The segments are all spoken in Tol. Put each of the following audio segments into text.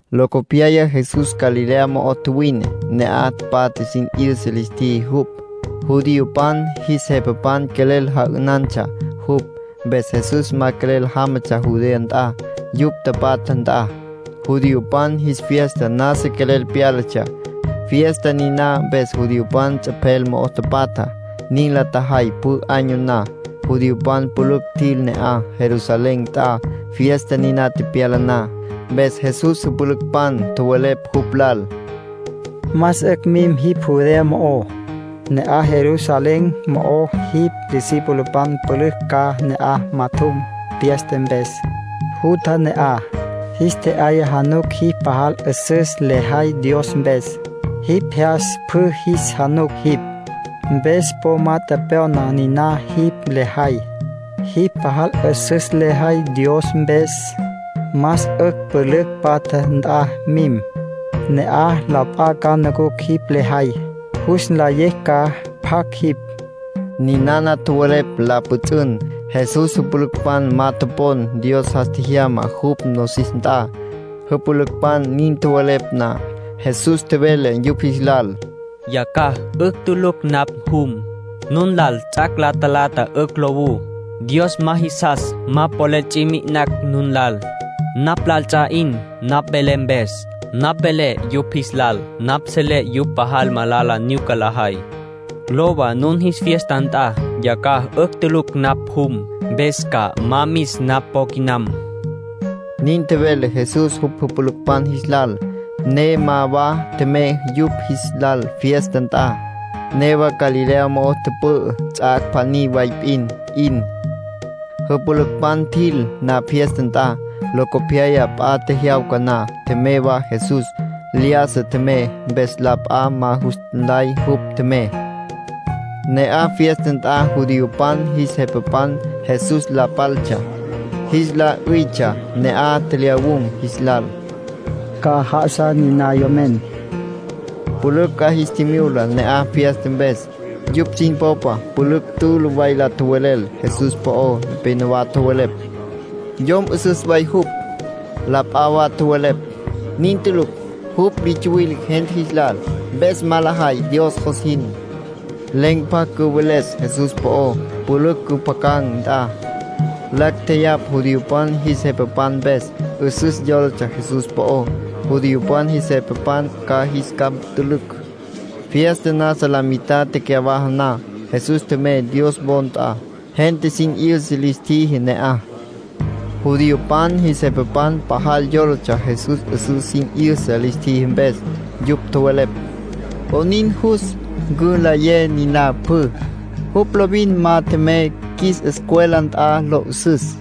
Locopyaya Jesús Galilea mo'o tjuwine; ne'aj patja sin 'yüsa lis tjiji jupj. Judiopan jis jepapan quelel ja'ünantsja jupj, mpes Jesús ma quelel jámatsja Judea nt'a, yupj tapatja nt'a. Judiopan jis fiesta nasa quelel pyálatsja. Fiesta niná mpes judiopan ts'epjel mo'o tapatja. Nin la tjajay pjü año na. Judiopan pülücj tjil ne'aj, Jerusalén nt'a, fiesta niná tepyala na. Mpes Jesús jüpülücpan tjowelepj jupj lal: —Más 'ücj mim jipj Judea mo'o. Ne'aj Jerusalén mo'ó jipj discipulopan pülücj ca ne'aj majatjum fiesta mpes. Jutja ne'aj, jis tje'yaya januc jipj pajal 'üsüs lejay Dios mpes. Jipj jyas pjü jis januc jipj, mpes po ma tjepjya'na niná jipj lejay. Jipj pajal 'üsüs lejay Dios mpes, más 'ücj pülücj patja nt'a mim. Ne'aj la p'a ca nucucj jipj lejay, jus nlayecj ca pjacj jipj. Ninana tjowelepj la pjüts'ün. Jesús jüpülücpan ma topon Dios jas tjejyama jupj nosis nt'a. Jüpülücpan nin tjowelepj na, Jesús tjevele yupj jis lal: —Yacjaj 'ücj tulucj napj jum. Nun lal ts'ac' la talata 'ücj lowú. Dios ma jisas ma polel ts'i mi'inacj nun lal. Napj lal ts'a 'in napj velé mpes. Napj velé yupj jis lal napj selé yupj pajal malala nyuca lajay. Lowa nun fiesta nt'a. Yacjaj 'ücj tulucj napj jum, mpes ca ma mis napj po quinam. Nin tjevele Jesús jupj jüpülücpan jis lal, ne ma wa tjemey yupj jis lal fiesta nt'a. Newa Galilea mo'o tüpü'ü ts'ac' pjaní way p'in 'in. Jüpülücpan tjil na fiesta nt'a, locopyaya p'a tjejyawca na, tjemey wa Jesús. Lyájasa tjemey, mpes la p'a ma jus nlay jupj tjemey. Ne'aj fiesta nt'a judiopan jis jepapan Jesús la paltsja. Jis la 'üytsja ne'aj tjelyawun̈ jis lal: “¿Ca'aj já'asa niná yomen?” Pülücj 'a jis tjimyula ne'aj fiesta mpes. Yupj sin popa pülücj tülü way la tjowelel Jesús po'ó. Nepénowa tjowelepj: “Yom 'üsüs way jupj”. La p'a wa tjowelepj: “Nin tulucj. Jupj li tsuwile gente jis lal, mpes ma lajay Dios jos jin.” Len̈ pjacj cüweles Jesús po'ó pülücj cüpjacan̈ nt'a. Lacj tjeyapj judiopan jis jepapan mpes. 'Üsüs yólatsja Jesús po'ó, judiopan jis jepapan ca jis capj ntülücj. Fiesta nasa la mitad tecyawaja na, Jesús tjemey Dios wo nt'a. Gente sin 'yüsa lis tjiji ne'aj. Judiopan jis jepapan pajal yólatsja Jesús 'üsüs sin 'yüsa lis tjiji mpes. Yupj tjowelepj: “¿'Onin jus cülayé niná pjü? Jupj lovin ma tjemey qjuis escuela nt'a lo 'üsüs.”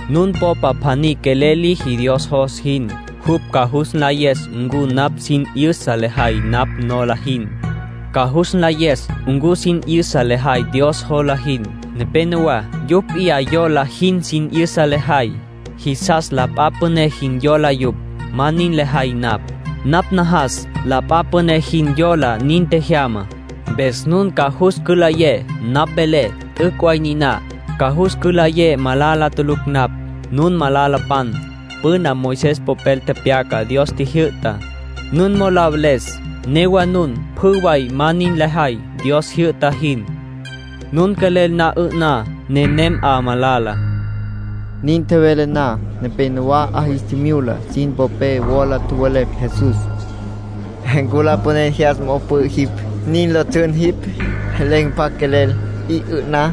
Nun popa pjaní quelel liji Dios jos jin, jupj ca jus nlayes ncu napj sin 'yüsa lejay napj nola jin, ca jus nlayes ncu sin 'yüsa lejay Dios jola jin. Nepénowa yupj p'iyá yola jin sin 'yüsa lajay, jisas la p'a püné jin yola yupj. Ma nin lejay napj. Napj najas la p'a püné jin yola nin tjejyamá. Mpes nun ca jus cülayé, napj velé, t'üc' way niná; ca jus cülayé malala tulucj napj. ”Nun malalapan. Püna Moisés papel tepyaca Dios tjijyü'tá, nun mo'o la veles. Newa nun pjü way ma nin lajay Dios tjijyü'ta jin. Nun quelel na 'ü'ná. Nenem 'a malala —tjevele Jesús. Nin tjevele na, nepénowa 'a jis tjimyula sin popé wola tjowelepj Jesús: —Lapanen jyas mo'o pü'ü jipj, nin lo ts'ün jipj. Len̈ pjacj quelel 'i 'ü'na.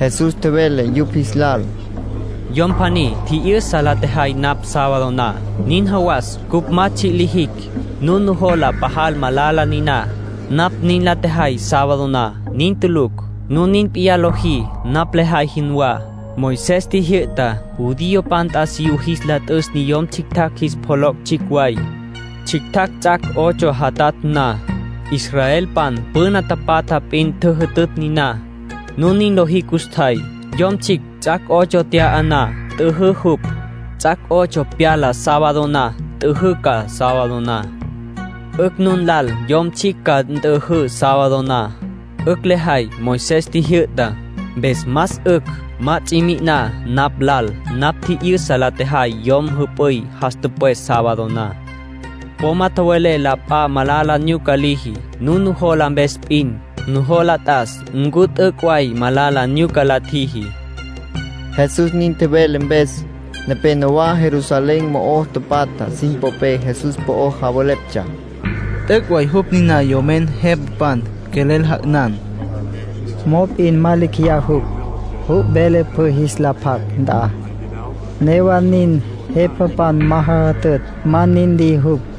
Jesús tjevele yupj jis lal: —Yom pjaní tji'yü'sa la tjejay napj sábado na, nin jawas cupj ma tsji' lijicj. Nun nujola pajal malala niná, napj nin la tjejay sábado na. Nin tulucj. Nun nin p'iyá lojí, napj lejay jinwá. Moisés tjijyü'ta judiopan t'asiyú jis la t'üs niyom tsjictjacj jis pjoloc' tsjicj way, tsjictjacj ts'ac' ocho jatatj na. (Israelpan püna tapatja p'in tjüjütütj niná.) Nun nin lojí custjay. Yom tsjicj ts'ac' ocho tya'a na, t'üjǘ jupj. Ts'ac' ocho pyala sábado na, nt'üjǘ ca sábado na. 'Ücj nun lal yom tsjicj ca nt'üjǘ sábado na, 'ücj la jay Moisés tjijyü'tá. Mpes más 'ücj ma ts'i mi'iná napj lal napj tji'yü'sa la tjejay yom jüp'üy jas tüpwes sábado na. Po ma tjowelé la p'a malala nyuca liji nun nujola mpes p'in. Nujola t'as ncu t'üc' way malala nyuca la tjiji. Jesús nin tjevele mpes, nepénowa Jerusalén mo'o tapatja sin popé Jesús po'o javeleptsja: “T'üc' way jupj niná yomen jepapan quelel ja'ünan. Mop'in ma lecj jeya jupj. Jupj vele pjü jis la pjac nt'a; newa nin jepapan ma jajütütj ma nin liji jupj.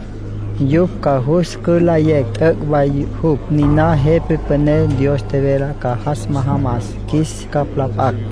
Yupj ca jus cülayecj t'üc' way jupj niná Jepa Püné Dios tjevele ca jas majamas qjuis capj la p'acj.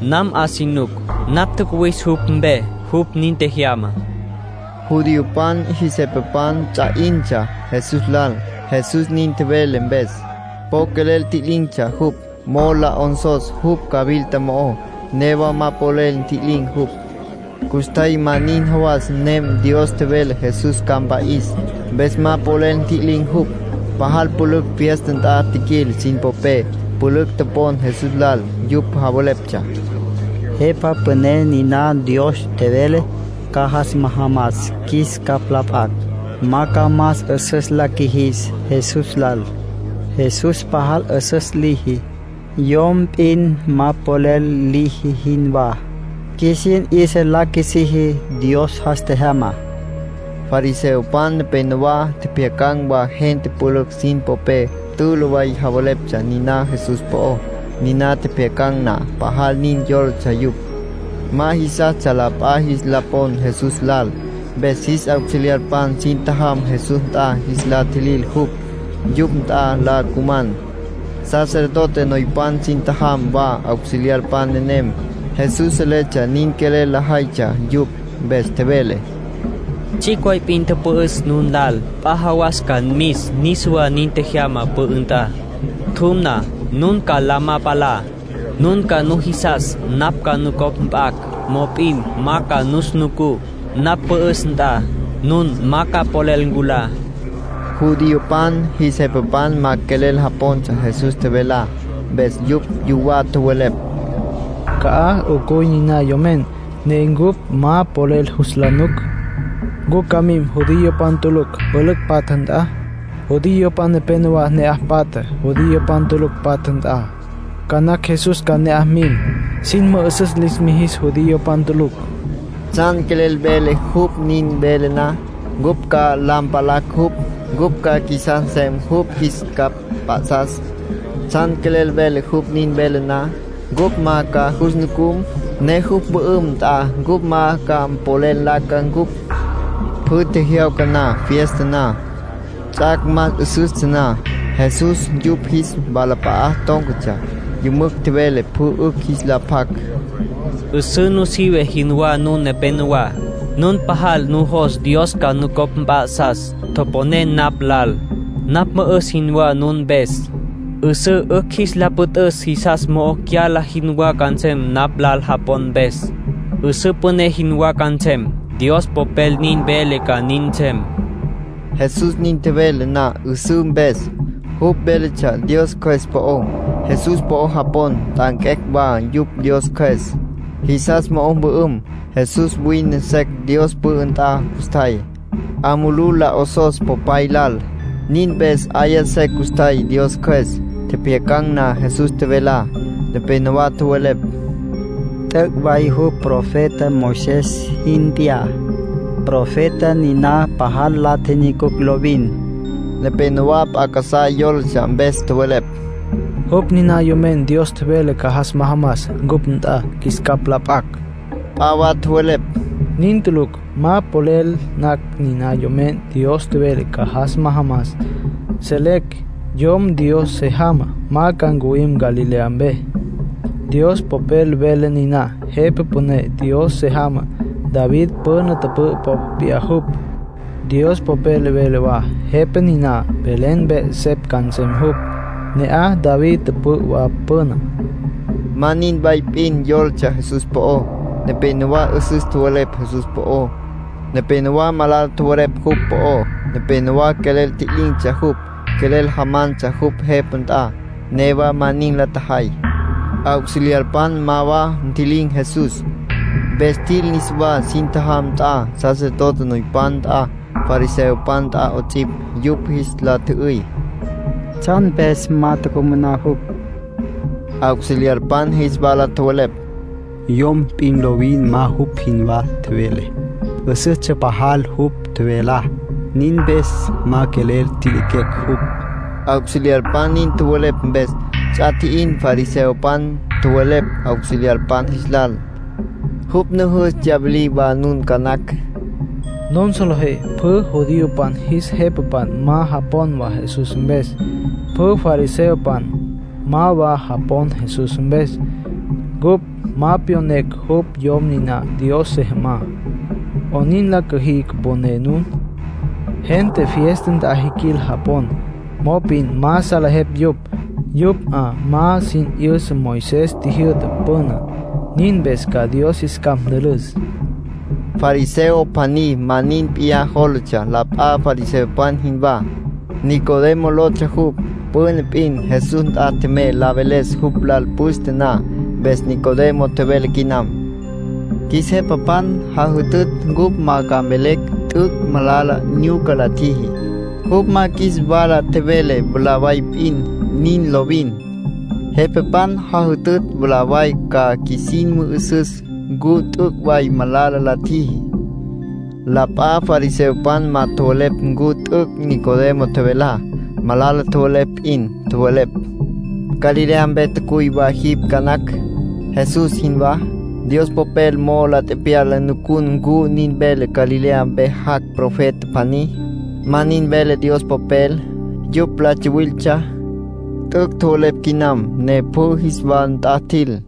Nam 'a si nuc. Napj tjacuwis jupj mpe; jupj nin tjejyama —nin tjevele Jesús. Judiopan jis jepapan ts'a 'intsja Jesús lal Jesús nin tjevele mpes. Po quelel ntji'lin̈tsja jupj, mo'o la 'onsos jupj cawilta mo'ó. Newa ma polel ntji'lin̈ jupj. Custjay ma nin jawas nem Dios tjevele Jesús ca mpa'is, mpes ma polel ntji'lin̈ jupj. Pajal pülücj fiesta nt'a tjiquil sin popé, pülücj topon Jesús lal. Yupj javeleptsja: “Jepa Püné niná Dios tjevele ca jas majamas qjuis capj la p'acj, ma ca más 'üsüs la qjuijis Jesús lal. Jesús pajal 'üsüs liji, yom p'in ma polel liji jinwá, qjuisin 'yüsa la qjuisiji Dios jas tjejyama.” Fariseopan nepenowá tjepjyacan̈ wa gente pülücj sin popé tülü way javeleptsja niná Jesús po'ó. Niná tjepjyacan̈ na, pajal nin yólatsja yupj. Ma jisastsja la p'a jis la pon Jesús lal. Mpes jis auxiliarpan sin tjajam Jesús nt'a jis la tjilil jupj, yupj nt'a la cuman. Sacerdote noypan sin tjajam wa auxiliarpan nenem. Jesús seletsja nin quelel lajaytsja yupj. Mpes tjevele: —Tsjicj way p'in pü'üs nun lal. P'a jawas ca mis niswá nin tjejyama pü'ü nt'a. Tjum na, nun ca la ma palá. Nun ca nujisas napj ca nucopj mp'acj. Mop'in ma ca nus nucú. Napj mpü'üs nt'a, nun ma ca polel nculá —tjevele jupj. Judiopan jis jepapan ma quelel japontsja Jesús tjevelá. Mpes yupj yuwá tjowelepj: “¿Ca'aj 'ucuy niná yomen, ne cupj ma polel jus la nuc? ¿Ncu ca mim judiopan tulucj pülücj patja nt'a? Judiopan nepénowa ne'aj patja judiopan tulucj patja nt'a. Ca nacj Jesús ca ne'aj mim, sin mü'üsüs lis mijis judiopan tulucj. ¿Tsjan quelel vele jupj nin vele na, cupj ca la mpalacj jupj, cupj ca qjuisas nsem jupj qjuis capj mp'a'sas? ¿Tsjan quelel vele jupj nin vele na, cupj ma ca jus nucum, ne jupj mpü'üm nt'a cupj ma ca polel nlaca cupj?” Pjü tjejyawca na fiesta na, ts'ac' más 'üsüstsja na, Jesús yupj jis walap'a'a tón̈catsja, yümücj tjevele pjü 'ücj jis la pjac: —'Üsǘ nusive jinwá nun nepenowá, nun pajal nujos Dios ca nucopj mp'a'sas. Toponé napj lal. Napj 'üsǘ jinwá nun mpes. 'Üsǘ 'ücj jis la püt'üs jisas mo'o cyala jinwá ca nsem napj lal japon mpes. 'Üsǘ püné jinwá ca nsem. Dios Popel nin vele ca nin nsem —nin tjevele Jesús. Jesús nin tjevele na 'üsǘ mpes, jupj véletsja Dios Cjües po'ó. Jesús po'o japon nt'anquecj wa yupj Dios Cjües, jisas mo'o mpü'üm. Jesús wine secj Dios pü'ü nt'a custjay, 'a mulú la 'osos Popay lal. Nin mpes 'aya secj custjay Dios Cjües. Tjepjyacan̈ na Jesús tjevelá, nepénowa tjowelepj: “T'üc' way jupj profeta Moisés jin p'iyá, profeta niná pajal la tjinyucucj lovin”. Nepénowa p'a casá yólatsja, mpes tjowelepj: “Jupj ninana Yomen Dios tjevele ca jas majamas cupj nt'a qjuis capj la p'acj”. P'a wa tjowelepj: “Nin tulucj. Ma polel nacj niná Yomen Dios tjevele ca jas majamas. Selecj Yom Dios se jamá ma ca ncuwim Galilea mpe.” Dios Popel vele niná Jepa Püné Dios se jamá David püna tüpü'ü popa p'iyá jupj. Dios Popel vele wa Jepa niná Belén mpe 'esepj ca nsem jupj. Ne'aj David tüpü'ü wa püná. Ma nin way p'in yólatsja Jesús po'ó. Nepénowa 'üsüs tjowelepj Jesús po'ó. Nepénowa malala tjowelepj jupj po'ó. Nepénowa quelel tji'lin̈tsja jupj, quelel jamantsja jupj jepa nt'a. Newa ma nin la tjajay. Auxiliarpan ma wa ntji'lin̈ Jesús, mpes tjil niswá sin tjajam nt'a, sacerdote noypan nt'a, fariseopan nt'a 'ots'ipj. Yupj jis la tjü'üy: —¿Tsjan mpes ma tucumaná jupj? Auxiliarpan jis wala tjowelepj: —Yom p'in lovin ma jupj jinwá tjevele. 'Üsüstsja pajal jupj tjevelá. Nin mpes ma quelel ntjiliquecj jupj. Auxiliarpan nin tjowelepj mpes, ts'a tji'in fariseopan. Tjowelepj auxiliarpan jis lal: —Jupj nujus tsyawilí wa nun ca nacj. Nun solejé pjü judiopan jis jepapan ma japon Jesús mpes. Pjü fariseopan ma wa japon Jesús mpes. Cupj ma pyonecj jupj yom niná Dios se jamá. ¿'Oyn la cüjí cüponé nun? Gente fiesta nt'a tjiquil japon, mop'in ma salejepj yupj. Yupj 'a ma sin 'yüsa Moisés tjijyü'tá püná. Nin mpes ca Dios jis capj ntülüs. Fariseo pjaní ma nin p'iyá jólatsja la p'a fariseopan jinwá. Nicodemo lotsja jupj. Püna p'in Jesús nt'a tjemey la veles jupj lal püste na. Mpes Nicodemo tjevele quinam: —Qjuis jepapan jajütütj cupj ma ca mvelecj t'üc' malala nyuca la tjiji, jupj ma qjuis wala tjevele mwalá way p'in. Nin lovin. Jepapan jajütütj mwalá way ca qjuisin mü'üsüs ncu t'üc' way malala la tjiji. La p'a fariseopan ma tjowelepj ncu t'üc' Nicodemo tjevelá. Malala tjowelepj p'in. Tjowelepj: —Galilea mpe tjacuy wa jipj ca nacj, Jesús jinwá. Dios Popel mo'ó la tepyala nucun ncu nin vele Galilea mpe jac' profeta pjaní. Ma nin vele Dios Popel. (Yupj la tsawiltsja.) T'üc' tjowelepj quinam, ne pjü jis wa nt'a tjil.